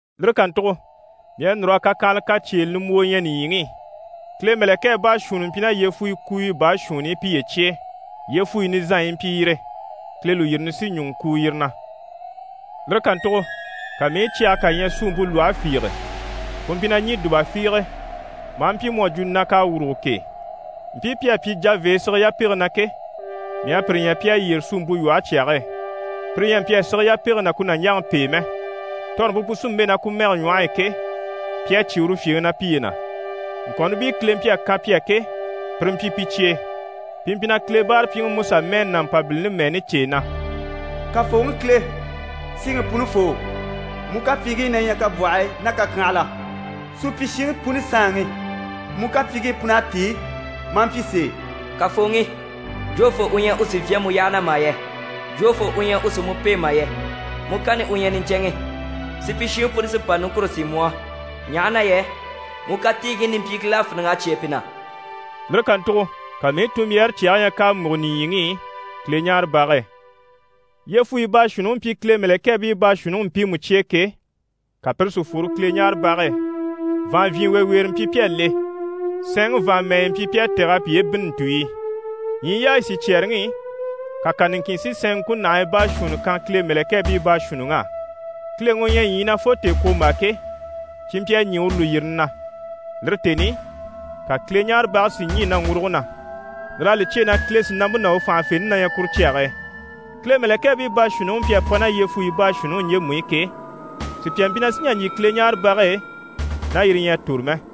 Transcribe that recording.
Lire kàntugo mii à núr'a kakyanhala kacyeele nimbwoo ɲya nìɲyiŋi i: Kile mɛ̀lɛkɛɛ baashuunni mpyi ná yyefugo kuuyo baashuunni i piye cye e. Yyefuyi nizanɲyi yi mpyi yire, Kile lùyirini sí ɲùŋɔ kuu yire na. Lire kàntugo ka mii i cyage kà ɲya suumpe lwɔhe fiige, ku mpyi na ɲî dùba fiige, maa mpyi mu à jwo na k'à wùrugo k'e. Mpii pi à pyi javee sige yapege na ke, mii à pire ɲya pi à yyére suumpe lwɔhe cyage e. Pire ɲyɛ a mpyi a sige yapege ná ku nàɲjaŋi pêe mɛ, tɔrɔmpe pu sí n‑bɛ̂ ná ku mɛge ɲwɔhe e ke, pi à cyé uru fyèŋi na piye na. Ŋkɔ̀nnibii Kile mpyi a kan pi á ke, pire mpyi pi cye e. Pi mpyi na Kile báarapyiŋi Musa mɛɛni ná Mpabilini mɛɛni cêe na: «Kafooŋi Kile, Siŋi Punifoo! Mu kapyiiŋkii na ɲyɛ kabwɔhii ná kakyanhala. Supyishiŋi puni Saanŋi, mu kapyiiŋkii pun'à tíi, maa mpyi sèe! Kafooŋi, jofoo u ɲyɛ u sì n‑fyá mu yyaha na mà yɛ? Jofoo u ɲyɛ u sì mu pêe mà yɛ? Mu kanni u ɲyɛ niɲcɛnŋi. Supyishiŋi puni sí n‑pa niŋkure sín mu á, ɲaha na yɛ mu katiigii nimpyiiŋkil'à fíniŋ'a cyêe pi na.» Lire kàntugo ka mii i tunmbyaare cyage ɲya k'à múgo nìɲyiŋi i Kileɲaarebage e. Yyefuyi baashuunniŋi mpyi Kile mɛ̀lɛkɛɛbii baashuunniŋi mpiimu cye e ke, ka pire si fworo Kileɲaarebage e. Vàanvyinweeweere mpyi pi à le. Sɛɛnŋi vàanmɛɛnyɛ mpyi pi à tɛ̀g'a piye bînni ntùɲyi i. Ɲyii yaayi sicyɛɛreŋi i, ka kà niŋkin si sɛɛn ŋkunahii baashuunni kan Kile mɛ̀lɛkɛɛbii baashuunniŋ'á. Kileŋi u ɲyɛ ɲyii na fo tèekwombaa ke, cyi mpyi a ɲî uru lùyirini na. Lire tèni i, ka Kileɲaarebage si ɲî naŋguruge na, lir'à li cyêe na Kile sìnampe ná u fànhafente na ɲyɛ kuru cyage e. Kile mɛ̀lɛkɛɛbii baashuunniŋi mpyi a pa ná yyefuyi baashuunniŋi ɲjemu i ke, sùpya mpyi na sì n‑jà n‑jyè Kileɲaarebage e ná yire ɲyɛ a tòro mɛ.